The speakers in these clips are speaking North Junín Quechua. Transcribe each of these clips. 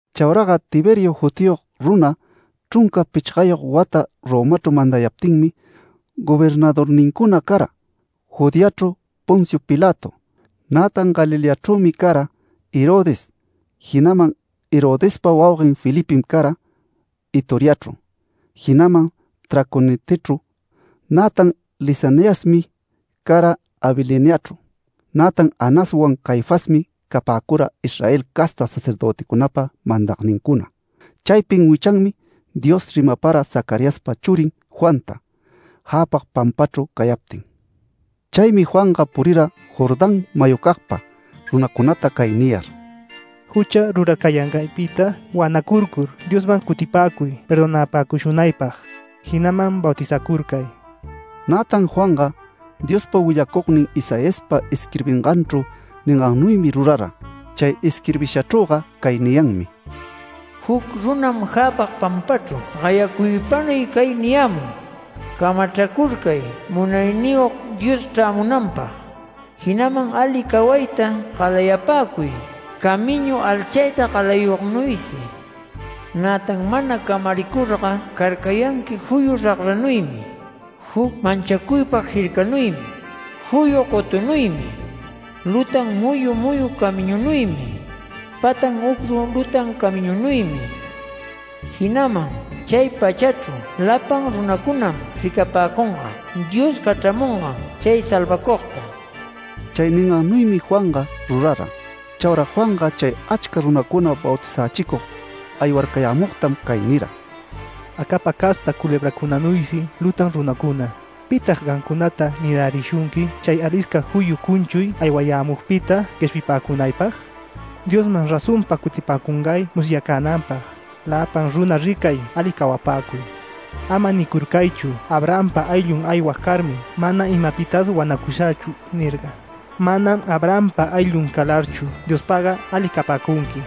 Chauraga Tiberio jutiyog runa chrunca pichgayog wata Romachru mandayaptinmi gobernadornincuna cara: Judeachru Poncio Pilato, nätan Galileachrümi cara Herodes, jinaman Herodespa wauguen Felipem cara Itureachru, jinaman Traconitechru, nätan Lisaniasmi cara Abiliniachru. Nätan Anaswan Caifasmi capäcura Israel casta sacerdöticunapa mandagnincuna. Chaypin wichanmi Dios rimapara Zacariaspa churin Juanta, jäpag pampachru cayaptin. Chaymi Juanga purira Jordán mayucagpa runacunata cay niyar: “Jucha rurarcayangaypita wanacurcur Diosman cutipäcuy perdonapäcushunaypag. Jinaman bautizacurcay”. Nätan Juanga, Diospa willacugnin Isaiaspa isquirbinganchru ningannuymi rurara. Chay isquirbishachrüga cay niyanmi: “Juc runam jäpag pampachru gayacuypanuy cay niyämun: ‘Camachracurcay Munayniyog Dios chrämunanpag, jinaman ali cawayta galayapäcuy, camiñu alchayta galayugnuysi. Nätan mana camaricurga carcayanqui juyu ragranuymi, juc manchacuypag jircanuymi, juyu gotunuymi, lutan muyu muyu camiñunuymi, patan ucrun lutan camiñunuymi. Jinaman chay pachachru lapan runacunam ricapäcunga Dios cachramungan chay salvacugta’”. Chay ningannuymi Juanga rurara. Chaura Juanga chay achca runacuna bautizächicug aywarcayämugtam cay nira: “Acapa casta culebracunanuysi lutan runacuna, ¿pitag gamcunata nirärishunqui chay alisca juyu cunchuy aywayämugpita gueshpipäcunaypag? Diosman razonpa cutipäcungay musyacänanpag, lapan runa ricay ali cawapäcuy. Ama nicurcaychu ‘Abrahampa ayllun aywag carmi mana imapitas wanacunächu’ nirga. Manam Abrahampa ayllun calarchu Diospagga ali capäcunqui.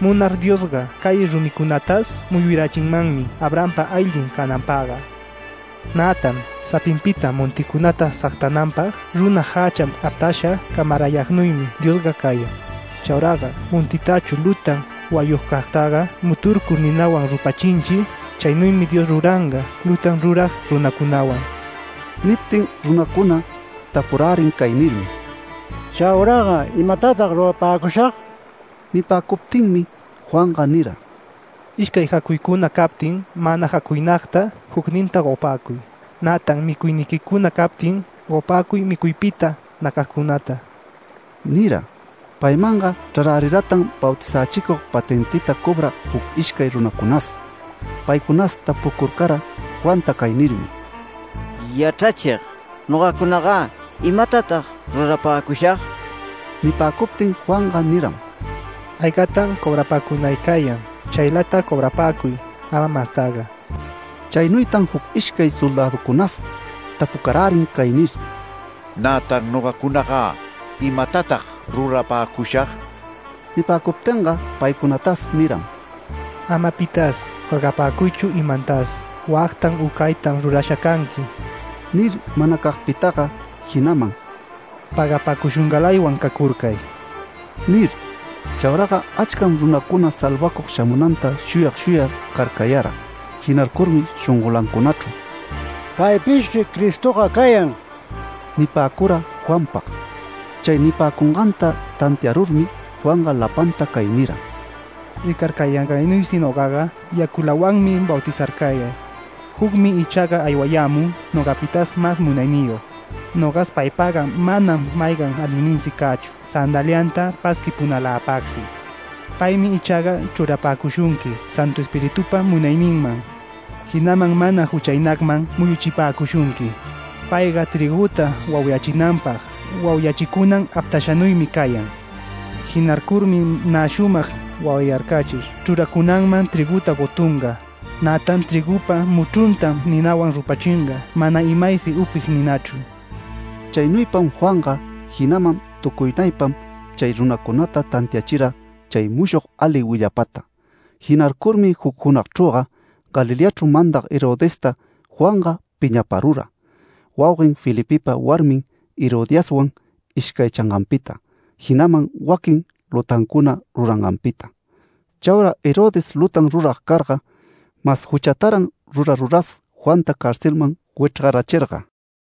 Munar Diosga cay rumicunatas muyurachinmanmi Abrahampa ayllun cananpagga. Nätan sapinpita monticunata sagtananpag runa jächan aptasha camarayagnuymi Diosga cayan. Chauraga montitachu lutan wayugcagtaga muturcur ninawan rupachinchi, chaynuymi Dios ruranga lutan rurag runacunawan”. Niptin runacuna tapurärin cay nirmi: “¿Chauraga imatatag rurapäcushag?” Nipäcuptinmi Juanga nira: “Ishcay jacuycuna captin mana jacuynagta jucninta gopäcuy. Nätan micuyniquicuna captin, gopäcuy micuypita nacagcunata” nira. Paymanga chraräriratan bautizächicug patentita cobrag juc ishcay runacunas. Paycunas tapucurcara Juanta cay nirmi: “Yachrachig, ¿nogacunagä? ¿Imatatag rurapäcushag?” Nipäcuptin Juanga niram: “Aygatam cobrapacunay cayan chaylata cobrapäcuy, ama mastaga”. Chaynuytan juc ishcay soldäducunas tapucarärin cay nir: “Nätan ¿nogacunagä? ¿Imatatag rurapäcushag?” Nipäcuptinga paycunatas niram: “Ama pitas jorgapäcuychu imantas, wactam u caytam rurasha canqui” nir manacagpitaga, jinaman “Pägapäcushungalaywan cacurcay” nir. Chauraga achcam runacuna salvacug shamunanta shuyag shuyag carcayarga. Jinarcurmi shongolancunachru “Paypishchri Cristoga cayan” nipäcura Juanpag. Chay nipäcunganta tantiarurmi Juanga lapanta cay nira: “Ricarcayangaynuysi nogaga yaculawanmi bautizarcayag. Jucmi ichaga aywayämun nogapitas mas munayniyog. Nogas paypagga manam maygan alinninsi cächu sandalianta pasquipunaläpagsi. Paymi ichaga chrurapäcushunqui Santu Espiritupa munayninman, jinaman mana juchaynagman muyuchipäcushunqui. Payga trïguta wauyachinapag wauyachicunan aptashanuymi cayan. Jinarcurmi nä shumag wauyarcachir chruracunanman trïguta gotunga. Nätan trïgupa muchruntam ninawan rupachinga mana imaysi upig ninachru”. Chaynuypam Juanga jinaman tucuynaypam chay runacunata tantiachira chay mushog ali willapata. Jinarcurmi juc junagchrüga Galileachru mandag Herodesta Juanga piñaparura, wauguen Felipepa warmin Herodiaswan ishcaychanganpita, jinaman waquin lutancuna ruranganpita. Chaura Herodes lutan rurag carga, mas juchataran ruraruras Juanta carcelman wichrgarachirga.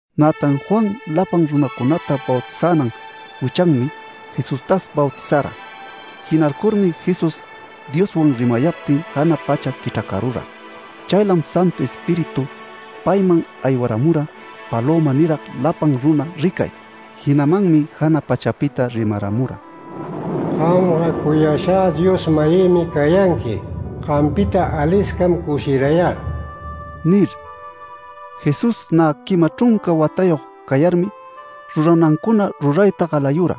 Nätan Juan lapan runacunata bautizänan wichanmi, Jesustas bautizara. Jinarcurmi Jesús Dioswan rimayaptin jana pacha quichracarura. Chaylam Santu Espíritu payman aywaramura palöma nirag lapan runa ricay. Jinamanmi jana pachapita rimaramura: “Gamga cuyashä Dios-mayïmi cayanqui. Gampita aliscam cushirayä” nir. Jesús nä quima chrunca watayog cayarmi ruranancuna rurayta galayura.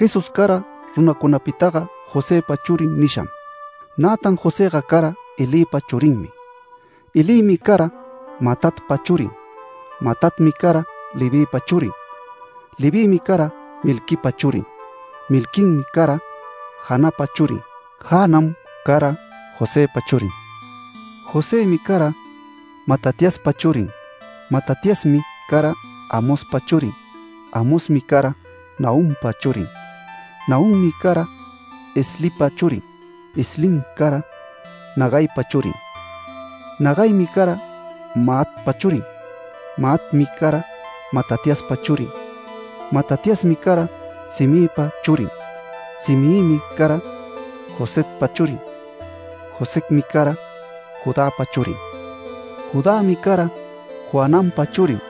Jesús cara runacunapitaga Josëpa churin nisham. Nätan Josëga cara Elïpa churinmi. Elïmi cara Matatpa churin, Matatmi cara Levïpa churin. Levïmi cara Melquipa churin. Melquim cara Janapa churin. Janam cara Josëpa churin. Josëmi cara Matatiaspa churin. Matatiasmi cara Amospa churin. Amosmi cara Nahumpa churin. Nahummi cara Eslipa churin. Eslim cara Nagaipa churin. Nagaimi cara Maatpa churin. Maatmi cara Matatiaspa churin. Matatiasmi cara Semeipa churin. Semeimi cara Josecpa churin. Josecmi cara Judäpa churin. Judämi cara Joananpa churin.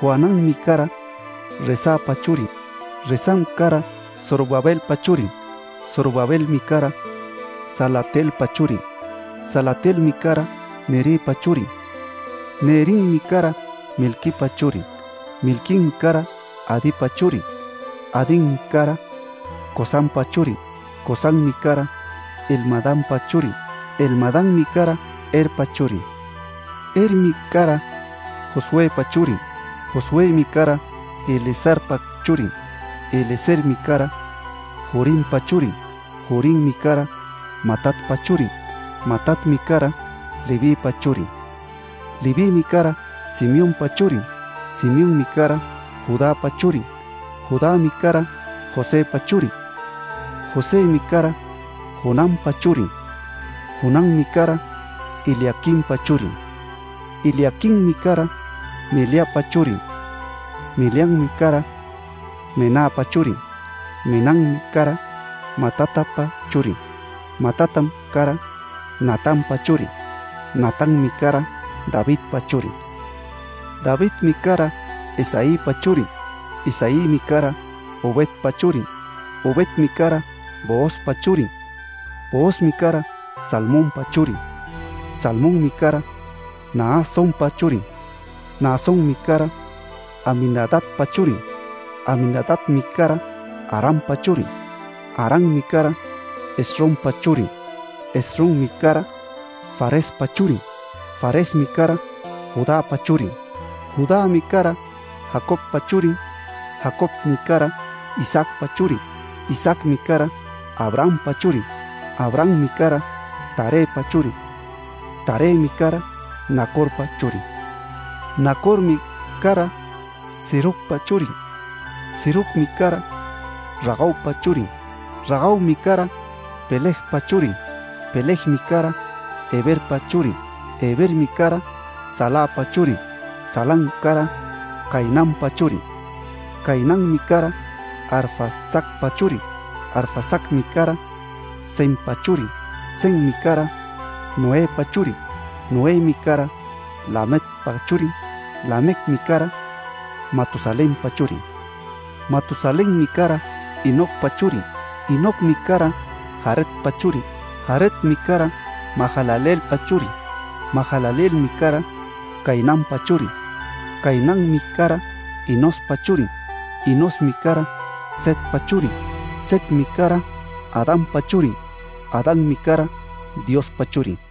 Joananmi cara Resapa churin. Resam cara Zorobabelpa churin. Zorobabelmi cara Salatielpa churin. Salatielmi cara Neripa churin. Nerim cara Melquipa churin. Melquim cara Adipa churin. Adim cara Cosampa churin. Cosammi cara Elmadampa churin. Elmadammi cara Erpa churin. Ermi cara Josuëpa churin. Josuëmi cara Eliezerpa churin. Eliezermi cara Jorimpa churin. Jorimmi cara Matatpa churin. Matatmi cara Levïpa churin. Levïmi cara Simeonpa churin. Simeonmi cara Judäpa churin. Judämi cara Josëpa churin. Josëmi cara Jonampa churin. Jonammi cara Eliaquimpa churin. Eliaquimmi cara Meleapa churin. Meleam cara Menapa churin. Menam cara Matatapa churin. Matatam cara Natanpa churin. Natanmi cara Davidpa churin. Davidmi cara Isaïpa churin. Isaïmi cara Obedpa churin. Obedmi cara Boozpa churin. Boozmi cara Salmonpa churin. Salmonmi cara Naasonpa churin. Naasonmi cara Aminadabpa churin. Aminadabmi cara Arampa churin. Arammi cara Esrompa churin. Esrommi cara Farespa churin. Faresmi cara Judäpa churin. Judämi cara Jacobpa churin. Jacobmi cara Isaacpa churin. Isaacmi cara Abrahampa churin. Abrahammi cara Tarëpa churin. Tarëmi cara Nacorpa churin. Nacormi cara Serugpa churin. Serugmi cara Ragaupa churin. Ragaumi cara Pelegpa churin. Pelegmi cara Heberpa churin. Hebermi cara Salapa churin. Salam cara Cainanpa churin. Cainanmi cara Arfaxadpa churin. Arfaxadmi cara Sempa churin. Semmi cara Noëpa churin. Noëmi cara Lamecpa churin. Lamecmi cara Matusalenpa churin. Matusalenmi cara Enocpa churin. Enocmi cara Jaredpa churin. Jaredmi cara Mahalaleelpa churin. Mahalaleelmi cara Cainanpa churin. Cainanmi cara Enospa churin. Enosmi cara Setpa churin. Setmi cara Adanpa churin. Adanmi cara Diospa churin.